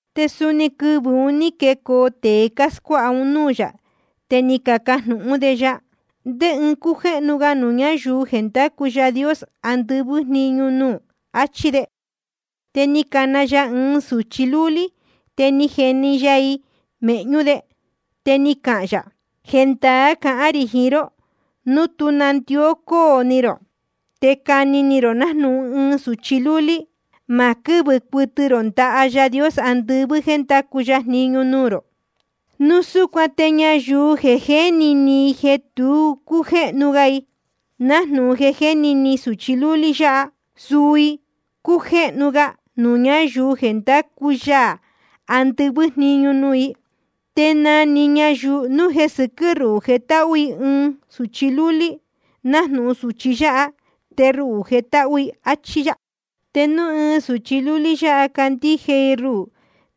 Te suni quɨvɨ̄ un ní quecoo tēe cáscuáha un núū yā, te ni cacajnūhún de ya: ¿Ndé ɨɨn cújéhnu ga nuū ñáyuu jeē ndácu Yaā andɨvɨ́ jniñu nuū? achí de. Te ni cana ya ɨɨn sūchi lúlí, te ni jeni ya i mēhñú de. Te ni cahān yā: Jendaá cahán rī jiín ró, núu tú nandió cóo ni rō te cani ni rō nájnūhun ɨɨn sūchi lúlí, ma quɨ́vɨ cuɨtɨ rō ndaha Yaā andɨvɨ́ jéē ndacu ya jniñu nuū rō. Núu súcuan te ñayuu jeē jéni ni i jeē tu cújéhnu i, nájnūhun jéni ni sūchi lúlí yáha, suu i cújéhnu ga nuū ñáyuu jeē ndácu Yaā andɨvɨ́ jniñu nuū. Te na‑ni ñayuu núu jeē sɨquɨ́ ruhū jetáhú i ɨɨn sūchi lúlí nájnūhun sūchi yáha, te ruhū jetáhú i. Achí yá. ’Te núu ɨɨn sūchi lúlí yáha cándíje i ruhū,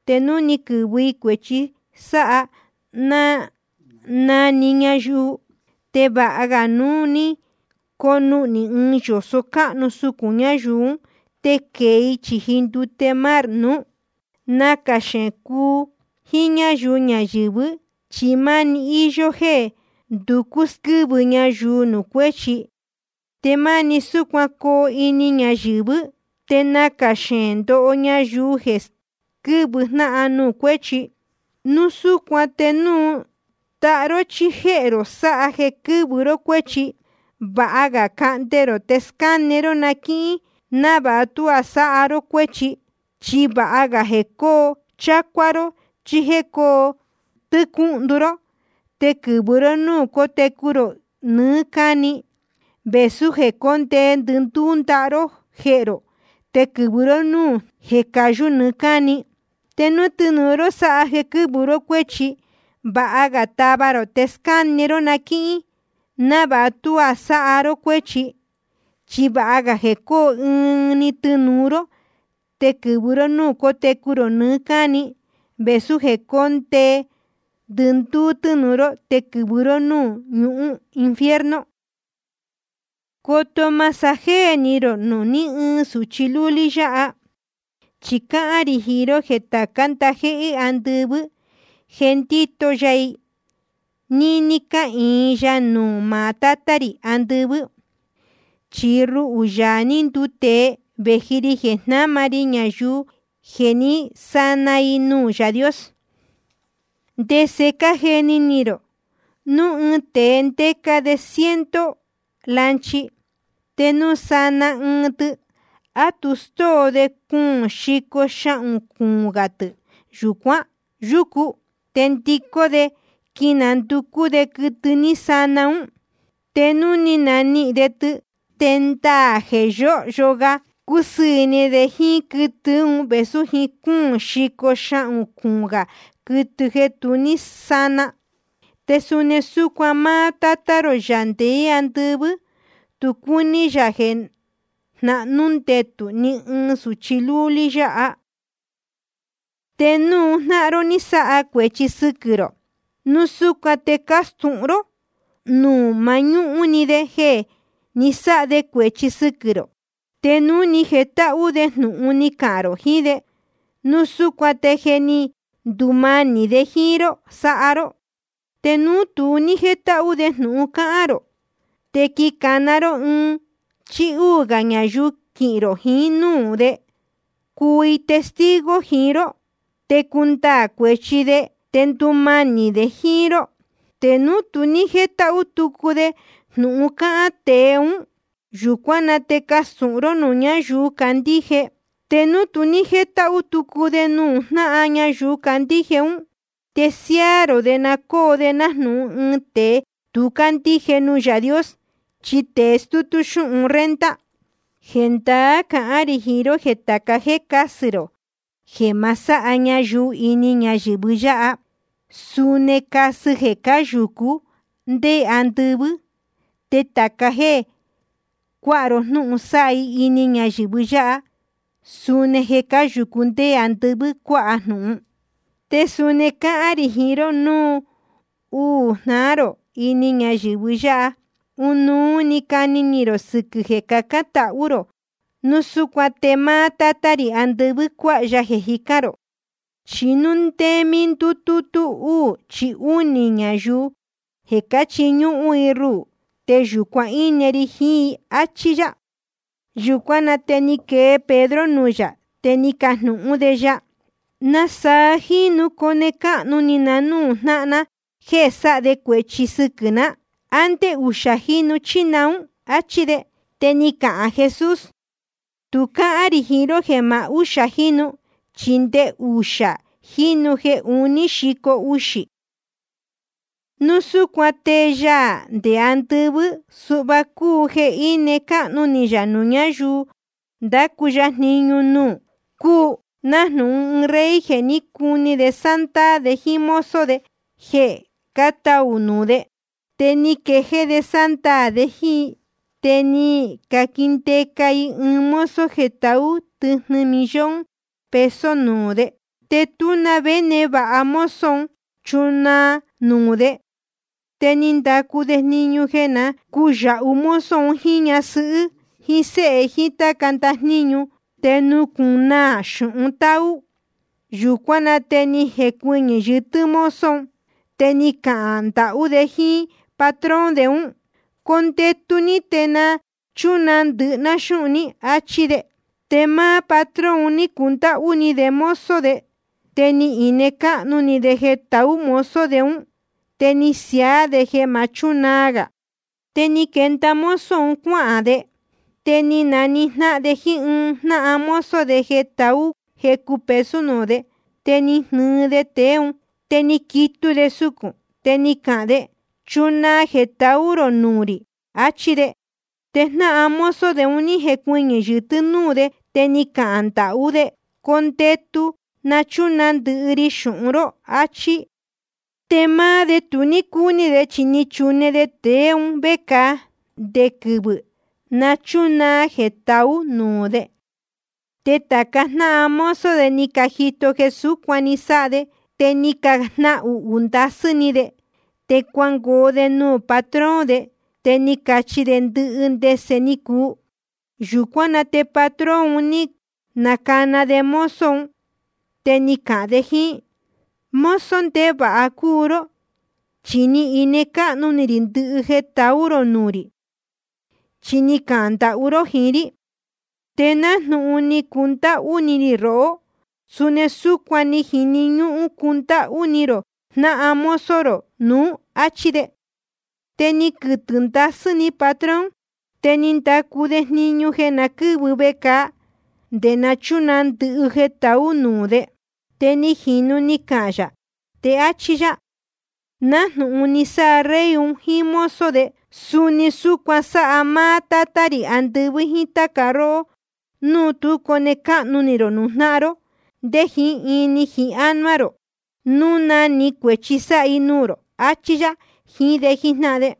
te núu quɨ̄vɨ i cuēchi sáha na‑ni ñayuu, te vāha ga núu ni conuhnī ɨɨn yōso cáhnu sucūn ñayuu ún, te quēe i chīji ndute mar nuú. Nacā xeēn cúu jíín ñáyuu ñayɨ̄vɨ́, chi máni íyó jéē nducú squɨ́vɨ ñayuu nuū cuéchi. Te máni súcuan coo ini ñayɨ̄vɨ́. Te nacā xeēn ndoho ñayuu jeē squɨ́vɨ jnáhan nuū cuéchi. ’Núu súcuan te núu ndaha ró chí jéhē rō sáha jeē quɨ́vɨ ró cuéchi, vāha ga cahnde rō te scáne ró na quíhín, návāha tuá sáha ró cuéchi. Chi vāha ga jeē coo chácuá ró chí coo tɨ́cúhndu ró te quɨ̄vɨ ró núū cotecu rō nɨɨ́ cáni, vēsú jeē cóndee ndɨndúú ndaha ró jéhē rō te quɨ̄vɨ ró núū ñuhún jeē cayú nɨɨ́ cáni. Te núu tɨnūu ró sáha jeē quɨ́vɨ ró cuéchi, vāha ga tava rō te scáne ró na quíhín, návāha tuá sáha ró cuéchi. Chi vāha ga jeē coo ɨɨn‑ni tɨnūu ró te quɨ̄vɨ ró núū cotecu rō nɨɨ́ cáni, vēsú jeē cóndee ndɨndúú tɨnūu ró te quɨ̄vɨ ró núū ñuhún infierno. ’Coto ma sájéē ni rō nuū ní ɨɨn sūchi lúlí yáha. Chi cáhán rī jiín ró jeē tācá ndajéhé andɨvɨ́ jéē ndíto ya i, níní cáhīin ya nuū maá Tátá rī andɨvɨ́. Chi ruhū, Yaā ní nduu tēe, vēji ri jeē jnáma ri ñayuu jeē ní sana i nuū Yaā Dios. ’¿Te ndese cájeni ni rō? Núu ɨɨn tēe ndéca de ɨɨn ciento lanchi, te núu sana ɨɨn tɨ, ¿á tu stóo de cuūn xico xahūn cuūn gā tɨ̄ yucu, te ndicó de quinanducú de quɨtɨ ní sana ún? Te núu ni nanihīn de tɨ, te ndaā jeē yóhyo ga cúsɨɨ̄ ni de jíín quɨtɨ ún vēsú jiín cúūn xico xahūn cuūn gā quɨtɨ jeē tu ní sána. Te suni súcuan máá Tátá rō, Yaā ndeé andɨvɨ́, tu cúní yā jeē jnahnú ndetū ni ɨɨn sūchi lúlí yáha. ’Te núu jnáhan ró ní sáha de cuēchi sɨquɨ̄ rō, núu súcuan te castūhun ró nuū mañúhún‑ni de jeē ni sáha de cuēchi sɨquɨ̄ rō. Te núu ni jetáhú de jnūhun ni cahān rō jiín de, núu súcuan te je ni ndumanī de jíín ró ni sáha ró. Te núu tu ní jétáhú de jnūhun cáhán rō, te quicāna ró ɨɨn chí úū gā ñayuu quihīn rō jiín núū de, cuu i testigo jiín ró, te cundaā cuēchi de te ndumanī de jíín ró. Te núu tu ní jétáhú tucu de jnūhun cácahān tēe ún, yūcuán na te castūhun ró nuū ñáyuu cácandíje. Te núu tu ní jétáhú tucu de jnūhun cahān ñayuu cácandíje ún, te siáá rō de na cóo de nájnūhun ɨɨn tēe tu cándíje nuū Yaā Dios chí tée stútú xúhun renta. ’Jendaá cahán rī jiín ró jéē tāca jéē cásɨ rō jeē ma sáha ñayuu ini ñayɨ̄vɨ yáha, suni casɨ jeē cáyūcú nde andɨvɨ́. Te tāca jéē cuáha ró jnúhun sáha i ini ñayɨ̄vɨ yáha, suni jeē cáyūcú nde andɨvɨ́ cuáha jnūhun. ’Te suni cáhán rī jiín ró, núu uū jnáhan ró ini ñayɨ̄vɨ yáha, ɨnuú cani ni rō sɨquɨ̄ ɨɨn jeē cacán tahú rō, núu súcuan te máá Tátá rī andɨvɨ́ cuāha ya jeē cájicān rō. Chi núu ndé mí ndútútú úū chí únī ñayuu jeē cáchiñúhún i ruhū, te yūcuan íne ri jiín i, áchí yá. Yūcuán na te ni quee Pedro nuū yā, te ni cajnūhún de ya: ¿Nasaa jínu cone cáhnu ni na núū jnáhan ná jéē sáha de cuēchi sɨquɨ̄ ná? ¿A ndé uxā jínu chí naún? áchí de. Te ni cahān Jesús: Tu cáhán rī jiín ró jeē maá úxā jínu, chi nde uxā jínu jeē uní xico uxī. ’Núu súcuan te Yaā ndeé andɨvɨ́, suhva cúu jeē íne cáhnu ni yā nuū ñáyuu ndácu ya jniñu nuū: Cúu nájnūhun ɨɨn rey jeē cuní de sándaā de jíín mozo de jeē cátaū nuū de. Te ni quejéé de sándaā de jíín i. Te ni caquindeca i ɨɨn mozo jeē taú tɨjnɨ millón peso nuū de. Te tú na vé névāha mozo un chunaa nuū de. Te ni ndacu de jniñu jeē na cúyāhu mozo un jíín ñasɨhɨ́ jíín séhe jíín táca ndajníñu, te nucūnaa xūhun táú. Yūcuán na te ni jecuɨñɨ̄ yɨtɨ́ mozo un, te ni cahān ndahú de jíín patrón de ún: Condetu ní, te na chúnaa ndɨhɨ ná xúhun ní, áchí de. Te máá patrón ni cundáhú ni de mozo de. Te ni ine cáhnu ni de jeē taú mozo de ún, te ni siaá de jeē ma chúnaa gā. Te ni quenda mozo un cuáhān de, te ni najnáhan‑ni de jíín ɨɨn jnáhan mozo de jeē taú jecu peso nuū de. Te ni jnɨɨ de tēe ún, te ni quitu de sucūn, te ni cahān de: Chunaa jeē taú rō nuū rī, achí de. Te jnáhan mozo de un ní jecuɨñɨ̄ yɨtɨ́ núū de, te ni cahān ndahú jíín de: Condetu te na chúnaa ndɨhɨ ri xūhun ró, achí. Te máá de tu ní cúní de, chi ni chune de tēe un vécāa nde quɨvɨ̄ nachunaa jeē taú nuū de. Te tāca jnáhan mozo de ni cajito jeē súcuan ni sáha de, te ni cajnahuhū ndasɨ́ ni de. Te cuangoo de nuū patrón de, te ni cacachi de ndɨhɨ ndese ni cuu. Yūcuán na te patrón un ní nacana de mozo un, te ni cahān de jíín: Mozo ndevāha cúu ró. Chi ni ine cáhnu ni rī ndɨhɨ jeē taú rō nuū rī, chi ni cahān ndahú ró jiín rí. Te nájnūhun ni cundáhú ni rī rohó, suni súcuan ni jini ñúhún cundáhú ni rō jnáhan mozo rō nuú, áchí de. Te ni quɨtɨ̄ ndasɨ́ ni patrón, te ni ndacu de jniñu jeē na quɨ́vɨ vecāa nde nachunaa ndɨhɨ jeē taú nuū de. Te ni jīnu ni cahān yā, te áchí yá: Nájnūhun ni sáha rey un jíín mozo de, suni súcuan sáha máá Tátá rī andɨvɨ́ jíín táca róhó núu tu cone cáhnu ni rō nuū jnáhan ró nde jiín ini jiín ánuá rō, núu na‑ni cuēchi sáha i nuū rō. Achí yá jiín de jíjnáhan de.